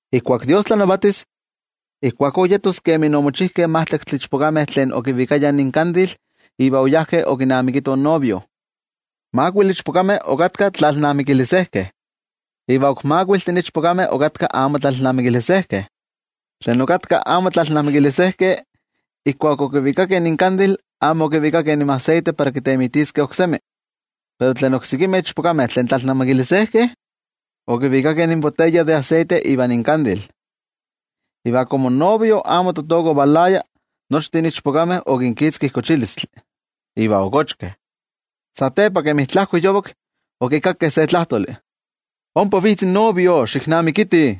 ’Ijkuakó kan Dios tlanavatia yetos kemi omochijkeh majtlaktli ichpokameh tlen okinvikayah inkandilvah iva oyajkeh okinamikitoh in novio. Makuili ichpokameh okatkah tlayejyekolejkeh iva ok makuiltih ichpokameh okatkah amo tlayejyekolejkeh. Tlen okatkah amo tlayejyekolejkeh, ijkuak okivikakeh inkandil, amo okivikakeh inmaseite para kintemitiskeh oksemi. Pero tlen oksekimeh ichpokameh tlen tlayejyekolejkeh okivikakeh intepalkav de aseite iva inkandil. Iva komo in novio amo totoka ovalaya, nochtin ichpokameh okinkitzki kochilistli, iva okochkeh. Satepa, kemi tlajko yovak, okikakkeh se tlajtoli: “¡Ompa vitz in novio, xiknamikitih!”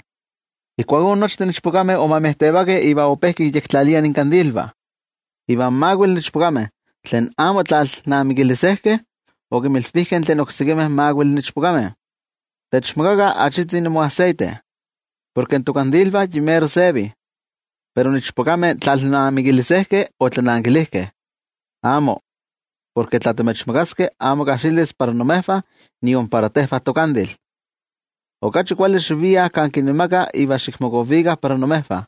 Ijkuakó nochtin ichpokameh omejtevakeh iva ope kinyektlaliah inkandilvah. Iva in makuili ichpokameh tlen amo tlayejyekolejkeh okinmilvijkeh tlen oksekimeh makuili ichpokameh: “Techmakakah se tzikitzi imoaseite, porke tokandilvah yi mero sevih.” Pero in ichpokameh tlayejyekolejkeh otlanankilijkeh: “Amó, porke tla timechmakaskeh amo kajxilis para imejvah iva nion para tejvah tokandil. Okachi kuali xiviah kan kinemakah iva xikmokovikah para imejvah.”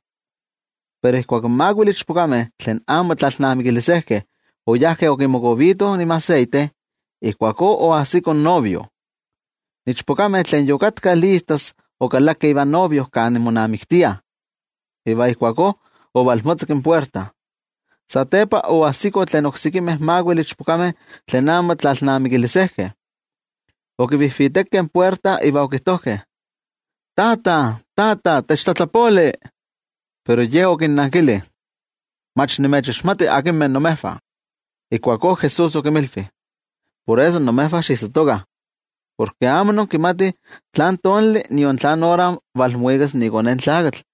Pero ijkuak in makuili ichpokameh tlen amo tlayejyekolejkeh oyajkeh okimokovitoh inmaseite, ijkuakó oajsiko in novio. In ichpokameh tlen yokatkah listas okalakeh ivan novio kan monamiktiah, iva ijkuakó ovalmotzakki in puerta. Satepa, oajsikoh tlen oksekimeh makuili ichpokameh tlen amo tlayejyekolejkeh, okivijvitekeh in puerta iva okijtojkeh: “¡Tata, tata, techtlatlapoli!” Pero ye okinnankili: “¡Mach nimechixmati akinmeh imejvah!” Ijkuakó Jesús okinmilvi: —Por eso imejvah xiijsatokah, porke amo inkimatih tlán tonali nion tlán ora valmuikas iKone in Tlakatl.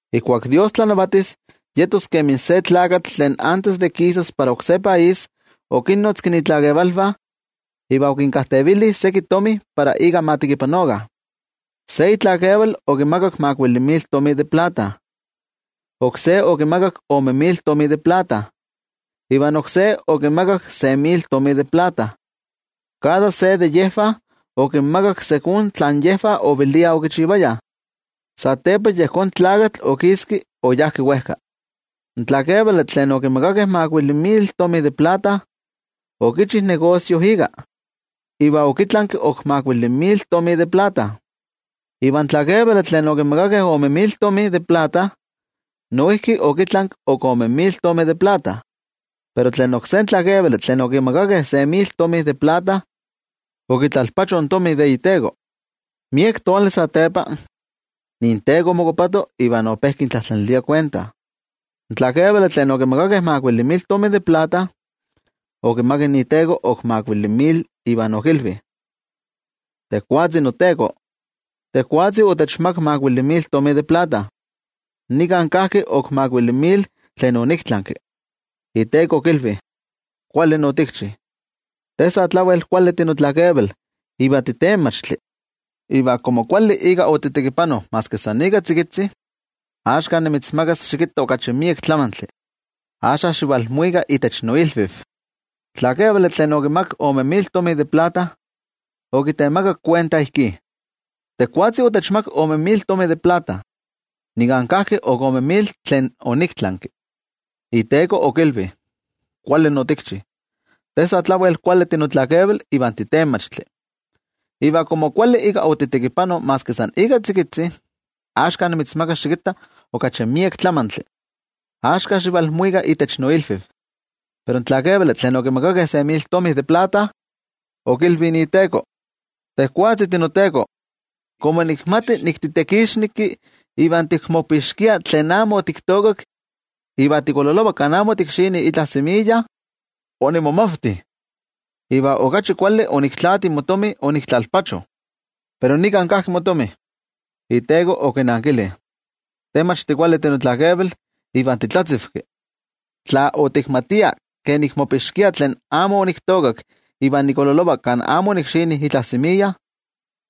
’Ijkuak Dios tlanavatis, yetos kemi se tlakatl tlen antes de kisas para oksé país, okinnotzki itlakevalvah iva okinkajtevili seki itomi para ika ma tekipanokah. ’Se itlakeval okimakak makuili mil tomi de plata, oksé okimakak ome mil tomi de plata, iva oksé okimakak se mil tomi de plata. Kada se de yejvah okinmakak ijkó kemi tlen yejvah oveliah okichivayah. Satepa yejón tlakatl okiski oyá wejka. In tlakevali tlen okimakakeh makuili mil tomi de plata, okichi negosio ika, iva okitlanki ok makuili mil tomi de plata. Iva in tlakevali tlen okimakakeh ome mil tomi de plata, noijki okitlanki ok ome mil tomi de plata. Pero tlen oksé tlakevali tlen okimakakeh se mil tomi de plata, okitlalpacho in tomi de iteko. ’Miek tonali satepa, inteko omokopato, iva ope kintlajtlanilia kuenta. In tlakevali tlen okimakakeh makuili mil tomi de plata, okimak iteko ok makuili mil, iva okilvi: “Tejwatzi noteko, tejwatzi otechmakak makuili mil tomi de plata, nika kajki ok makuili mil tlen oniktlanki.” Iteko okilvi: “Kuali otikchi. Te sa tlawel kuali tinotlakeval iva titenmachtli. Iva komo kuali ika otitekipano maski san ika tzikitzi, axka nimitzmakas xikitta okachi miek tlamantli. Axka xivalmuika itech noilviv.” In tlakevali tlen okimakakeh ome mil tomi de plata, okitemakak kuenta ijkí: “Tejwatzi noteko, tejwatzi otechmakak ome mil tomi de plata, nika kajki ok ome mil tlen oniktlanki.” Iteko okilvi: “Kuali otikchi. Te sa tlawel kuali tinotlakeval iva titenmachtli. Iva komo kuali ika otitekipano maski san ika tzikitzi, axka nimitzmakas xikitta okachi miek tlamantli. Axka xivalmuika itech noilviv.” Pero in tlakevali tlen okimakakeh se mil tomi de plata, okilvi iteko: “Tejwatzi noteko, komo nikmati nik titekixneki, iva tikmopixkia tlen amo otiktookak iva tikololova kan amo otikxini itla semiya, onimomavti, iva okachi kuali oniktlaati motomi oniktlalpacho. Pero nika kajki motomi.” Iteko okinankili: “Te mach tikuali tinotlakeval iva titlatzivki, tla otikmatia ke nikmopixkia tlen amo oniktookak iva nikololova kan amo onikxini itla semiya,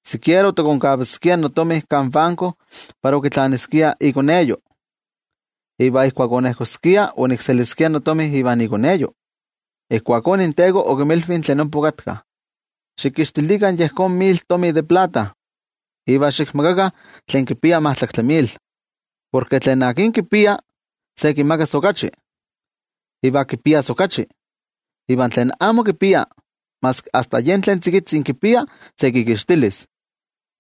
sikiera otikonkavaskia notomi kan banko para okitlaniskia ikoneyo, iva ijkuak onejkoskia, onikseliskia notomi ivan ikoneyo.” Ijkuakó inteko okinmilvi tlen ompa okatkah: “Xikixtilikah yejón mil tomi de plata, iva xikmakakah tlen kipia majtlaktli mil. Porke tlen kipia, se kimakas okachi, iva kipias okachi. Iva tlen amo kipia, maski asta yen tlen tzikitzi kipia se kikixtilis.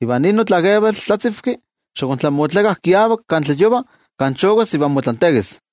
Iva nin notlakeval tlatzivki, xiktlamotlakah kiavak kan tlayova kan chokas iva motlantekis.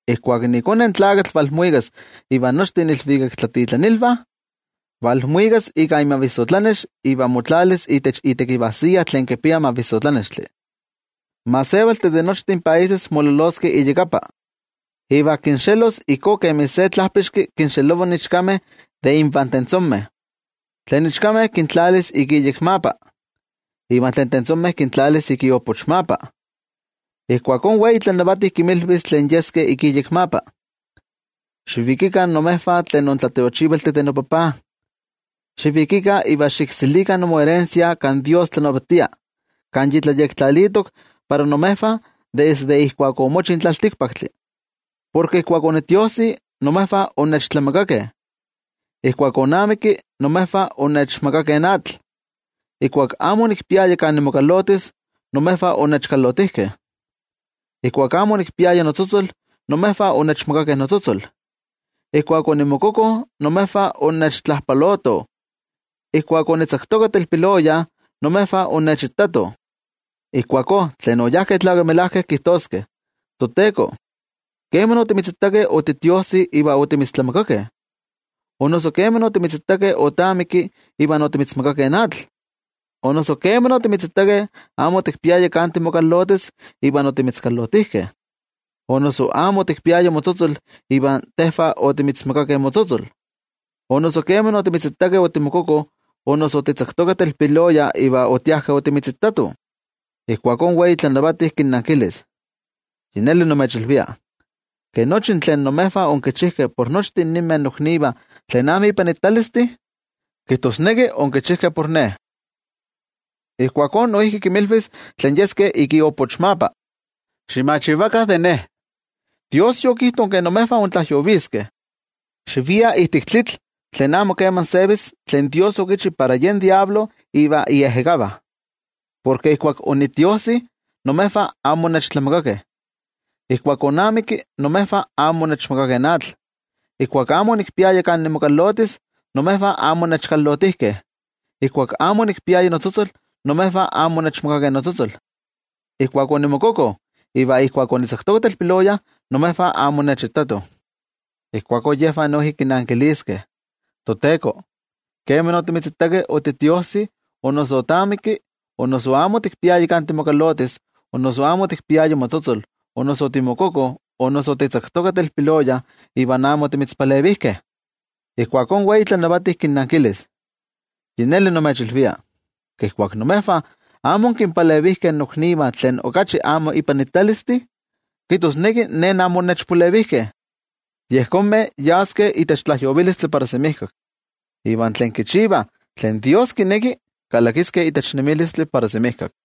’Ijkuak iKone in Tlakatl valmuikas ivan nochtin iilvikaktlatitlanilvah, valmuikas ika imavissotlanex iva motlalis itech itekivajsiya tlen kipia mavissotlanextli. In gentejtih de nochtin países mololoskeh iyakapa, iva kinxelos ijkó kemi se tlajpixki kinxelova in ichkameh de invan tentzomeh. Tlen ichkameh kintlalis ik iyekmapa iva tlen tentzomeh kintlalis ik iopochmapa. Ijkuakó in Wei tlanavati kinmilvis tlen yeskeh ik iyekmapa: “Xivikikah imejvah tlen intlatiochivaltih de noTajtzi. Xivikikah iva xikselikah imoerensia kan Dios tlanavatia, kan yi tlayektlalitok para imejvah desde ijkuak omochi in tlaltikpaktli. Porke ijkuak onitiojsi, imejvah onnechtlamakakeh. Ijkuak onamikki, imejvah onnechmakakeh atl. Ijkuak amo onikpiaya kan nimokalotis, imejvah onnechkalotijkeh. Ijkuak amo onikpiaya notzotzol, imejvah onnechmakakeh notzotzol. Ijkuak onimokoko, imejvah onnechtlajpalotoh. Ijkuak onitzaktoka telpiloya, imejvah onnechitatoh.” Ijkuakó tlen oyajkeh tlakamelajkeh kijtoskeh: “ToTeko, ¿keman otimitzitakeh otitiojsi, iva otimitztlamakakeh? ¿O noso keman otimitzitakeh otamikki, iva otimitzmakakeh atl? ¿O noso keman otimitzitakeh amo otikpiaya kan timokalotis, iva otimitzkalotijkeh, o noso amo otikpiaya motzotzol, iva tejvah otimitzmakakeh motzotzol? ¿O noso keman otimitzitakeh otimokoko, o noso otitzaktoka telpiloya, iva otiajkeh otimitzitatoh?” Ijkuakó in Wei tlanavati kinnankilis: “Yi neli nimechilvia, ke nochi tlen imejvah onkichijkeh por nochtin ninmeh noknivah tlen amo ipanitalistih, kijtosneki onkichijkeh por ne.” ’Ijkuakó noijki kinmilvis tlen yeskeh ik iopochmapa: “Ximachivakah de ne, Dios yokijto ke imejvah intlajyoviskeh. Xiviah ijtik tlitl tlen amo keman sevi tlen Dios okichi para yen Amo Kuali Tlakatl ivan iejekavah. Porke ijkuak onitiojsi, imejvah amo onnechtlamakakeh. Ijkuak onamikki, imejvah amo onnechmakakeh atl. Ijkuak amo onikpiaya kan nimokalotis, imejvah amo onnechkalotijkeh. Ijkuak amo onikpiaya notzotzol, imejvah amo onnechmakakeh notzotzol. Ijkuak onimokoko iva ijkuak onitzaktoka telpiloya, imejvah amo onnechitatoh.” Ijkuakó yejvah noijki kinankiliskeh: “ToTeko, ¿keman otimitzitakeh otitiojsi o noso otamikki, o noso amo otikpiaya kan timokalotis, o noso amo otikpiaya motzotzol, o noso otimokoko, o noso otitzaktoka telpiloya iva amo otimitzpalevijkeh?” Ijkuakó in Wei tlanavati kinnankilis: “Yi neli nimechilvia, ke ijkuak imejvah amo onkinpalevijkeh noknivah tlen okachi amo ipanitalistih, kijtosneki ne amo onnechpalevijkeh.” Yejonmeh yaskeh itech tlajyovilistli para semijkak, iva tlen tlakamelajkeh kalakiskeh itech nemilistli para semijkak.